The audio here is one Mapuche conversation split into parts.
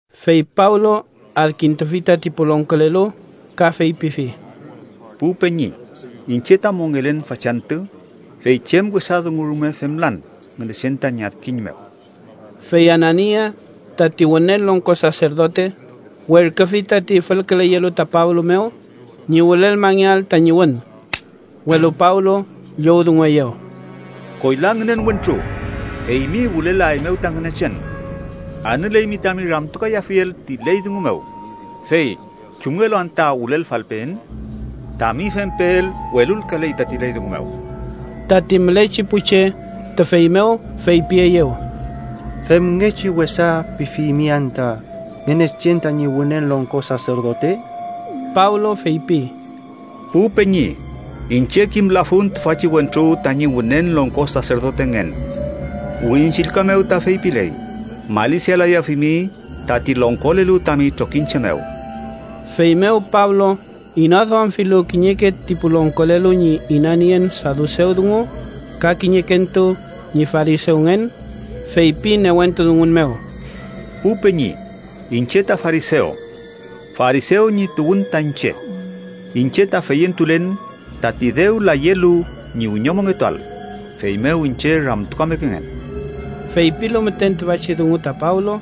Fey Pablo adkintufi tati pu longkolelu ka feypifi: —Pu peñi, iñche ta mongelen fachantü fey chem wesa dungu rume femlan Ngünechen tañi adkiñ mew. Fey Anania tati Wünen Longko Saserdote werküfi tati fülküleyelu ta Pablo mew ñi wülelmangeael tañi wün. Welu Pablo llowdungueyew: —¡Koyla ngünen wentru, eymi wülelaeymew ta Ngünechen! Anüleymi tami ramtukayafiel ti ley dungu mew, fey ¿chumngelu anta wülelfalpeen? Tami fempeel welulkaley tati ley dungu mew. Tati mülechi pu che tüfey mew feypieyew: —¿Femngechi wesa pifimi anta Ngünechen tañi Wünen Longko Saserdote? Pablo feypi: —Pu peñi, iñche kimlafun tüfachi wentru tañi Wünen Longko Saserdotengen. Wirin Chillka mew ta feypiley: ‘Malisialayafimi tati longkolelu tami trokiñche mew.’ Feymew, Pablo inaduamfilu kiñeke ti pu longkolelu ñi inanien sadusew dungu ka kiñekentu ñi farisewngen, feypi newentu dungun mew: —Pu peñi, iñche ta farisew. Farisew ñi tuwün ta iñche. Iñche ta feyentulen tati dew layelu ñi wiñomongetuael, feymew iñche ramtukamekengen. Feypilu müten tüfachi dungu ta Pablo,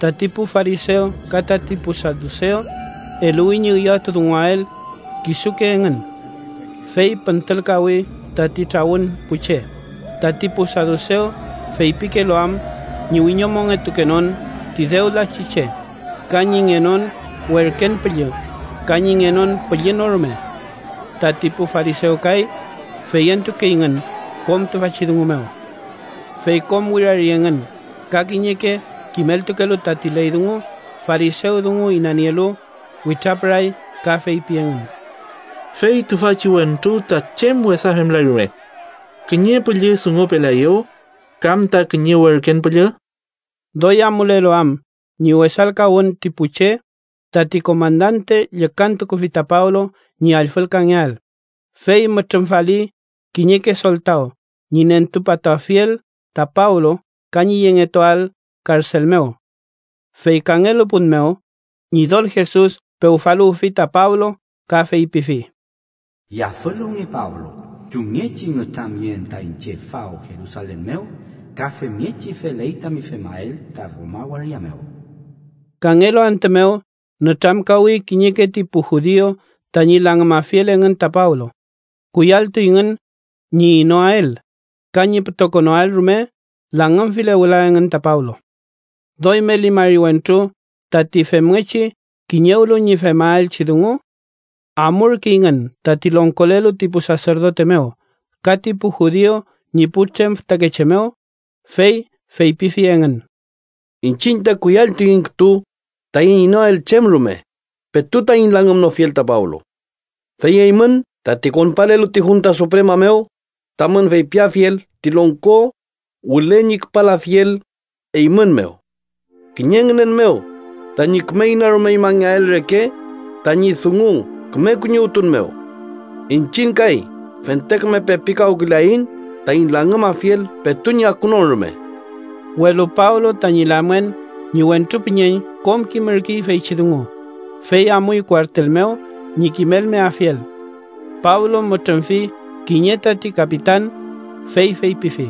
tati pu farisew ka tati pu sadusew, eluwi ñi üyawtudunguael kisuke engün. Fey püntülkawi tati trawün pu che, tati pu sadusew feypikelu am ñi wiñomongetukenon ti dew lachi che, ka ñi ngenon werken püllü ka ñi ngenon püllü no rume. Tati pu farisew kay feyentukeyngün kom tüfachi dungu mew. Fey kom wirari engün ka kiñeke kimeltukelu tati ley dungu, farisew dungu inanielu, witrapüray ka feypi engün: —Fey tüfachi wentru ta chem wesa femlay rume. ¿Kiñe püllü dungupelaeyew kam ta kiñe werken püllü? Doy amulelu am ñi wesalkawün ti pu che tati komandante llükantukufi ta Pablo ñi allfülkangeael, fey mütrümfali kiñeke soltaw ñi nentupatuafiel ta Pablo ka ñi yengetuael karsel mew. Fey kangelu pun mew, Ñidol Jesus pewfaluwfi ta Pablo ka feypifi: “Yafüluwnge, Pablo. Chumngechi nütramyeen ta iñche faw Jerusalen mew, ka femngechi feley tami femael ta Roma waria mew.” Kangelu antü mew, nütramkawi kiñeke ti pu judiu tañi langümafiel engün ta Pablo. Kuyalltuyngün ñi inoael ka ñi pütokonoael rume langümfile wüla engün ta Pablo. Doy meli mari wentru tati femngechi kiñewlu ñi femaelchi dungu. Amurkeyngün tati longkolelu ti pu saserdote mew ka ti pu judiu ñi putrem fütakeche mew, fey feypifi engün. —Iñchiñ ta kuyalltuiñ rume taiñ inoael chem rume petu taiñ langümnofiel ta Pablo. Fey eymün, tati konpalelu ti junta suprema mew tamün feypiafiel ti longko wüle ñi küpalafiel eymün mew, kiñe ngünen mew tañi küme inarumeñmangeael reke tañi dungu küme kuñiwtun mew. Iñchiñ kay fente küme pepikawküleaiñ taiñ langümafiel petu ñi akunon rume. Welu Pablo tañi lamngen ñi wentru püñeñ kom kimürkey feychi dungu, fey amuy kuartel mew ñi kimelmeafiel. Pablo mütrümfi kiñe tati kapitan, fey feypifi: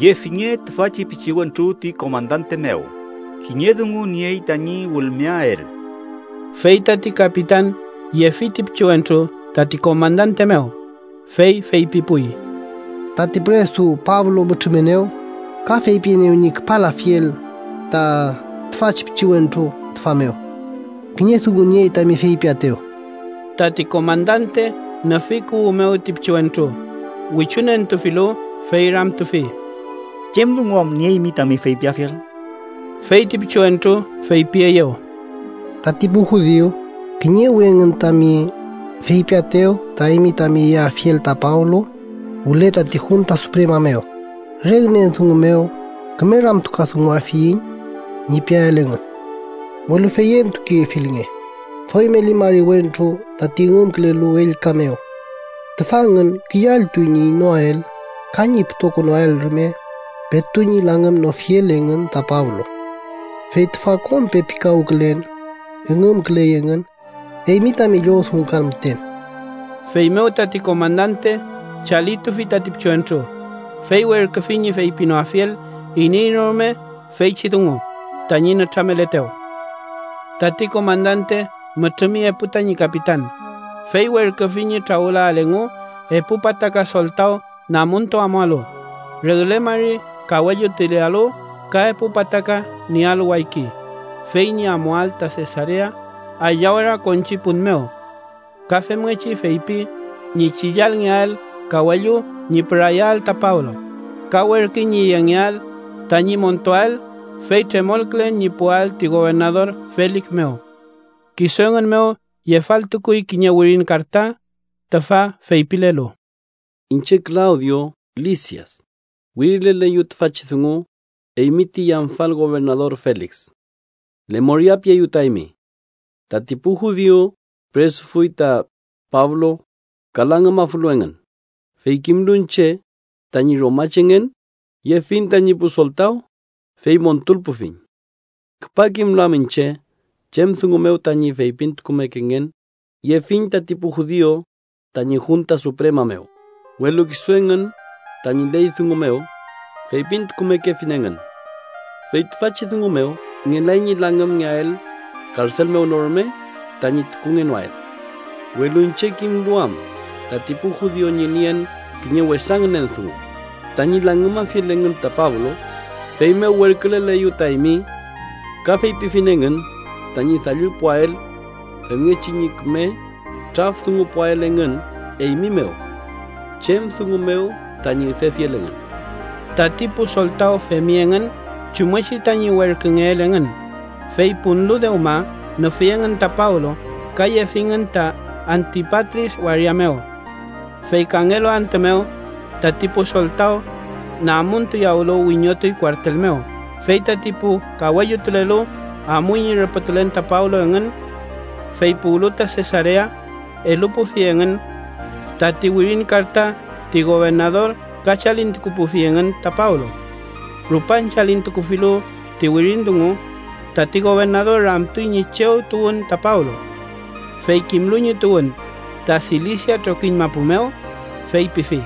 —Yefinge tüfachi pichiwentru ti komandante mew. Kiñe dungu niey tañi wülmeael. Fey tati kapitan yefi ti pichiwentru tati komandante mew, fey feypipuy: —Tati püresu Pablo mütrümenew ka feypienew ñi küpalafiel ta tüfachi pichiwentru tüfa mew. Kiñe dungu niey tami feypiaetew. Tati komandante nüfi kuwü mew ti pichiwentru, wichunentufilu, fey ramtufi: —¿Chem dungu am nieymi tami feypiafiel? Fey ti pichiwentru feypieyew: —Tati pu judiu kiñewi engün tami feypiaetew ta eymi tami yeafiel ta Pablo wüle tati junta suprema mew, re ngünen dungu mew ‘küme ramtukadunguafiyiñ’ ñi piael engün. Welu feyentukefilnge, doy meli mari wentru tati üngümkülelu ellka mew. Tüfa engün kuyalltuy ñi inoael ka ñi pütokonoael rume petu ñi langümnofiel engün ta Pablo. Fey tüfa kom pepikawkülen üngümküley engün eymi tami llowdungukan müten. Feymew tati komandante chalitufi tati pichiwentru, fey werküfi ñi feypinoafiel iney no rume feychi dungu tañi nütrameletew. Tati komandante mütrümi epu tañi kapitan, fey werküfi ñi trawülael engu epu pataka soltaw namuntu amualu, regle mari kawellutulealu ka epu pataka niealu wayki, fey ñi amuael ta Sesarea aylla ora konchi pun mew. Ka femngechi feypi ñi chillalngeael kawellu ñi pürayael ta Pablo, ka werküy ñi yengeael tañi montuael fey tremolkülen ñi puwael ti gobernador Felik mew. Kisu engün mew yefaltukuy kiñe wirin karta, tüfa feypilelu: Iñche Klawdio Lisias, wirileleyu tüfachi dungu, eymi ti yamfal gobernador Felik: Lemoria pieyu ta eymi. Tati pu judiu püresufuy ta Pablo ka langümafulu engün, fey kimlu iñche tañi romachengen, yefiñ tañi pu soltaw, fey montulpufiñ. Küpa kimlu am iñche chem dungu mew tañi feypintukumekengen, yefiñ tati pu judiu tañi junta suprema mew, welu kisu engün tañi ley dungu mew feypintukumekefi engün, fey tüfachi dungu mew ngelay ñi langümngeael, karsel mew no rume tañi tukungenoael. Welu iñche, kimlu am tati pu judiu ñi nien kiñe wesa ngünen dungu tañi langümafiel engün ta Pablo, feymew werküleleyu ta eymi. Ka feypifiñ engün tañi dallupuael femngechi ñi küme traf dungupuael engün eymi mew chem dungu mew tañi üdefiel engün. Tati pu soltaw femi engün chumngechi tañi werküngeel engün, fey punlu dewma, nüfi engün ta Pablo ka yefingün ta Antipatris waria mew. Fey kangelu antü mew, tati pu soltaw namuntuyawlu wiñotuy kuartel mew, fey tati pu kawellutulelu amuy ñi rüpütulen ta Pablo engün. Fey puwlu ta Sesarea, elupufi engün tati wirin karta ti gobernador ka chalintukupufi engün ta Pablo. Rupan chillkatufilu ti wirin dungu, tati gobernador ramtuy ñi chew tuwün ta Pablo. Fey kimlu ñi tuwün ta Silisia trokiñ mapu mew, feypifi: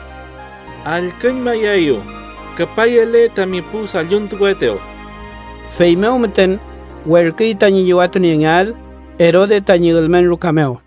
—Allküñmayaeyu küpayele tami pu dalluntukuetew. Feymew müten werküy tañi llüwatuniengeael Erode tañi ülmen ruka mew.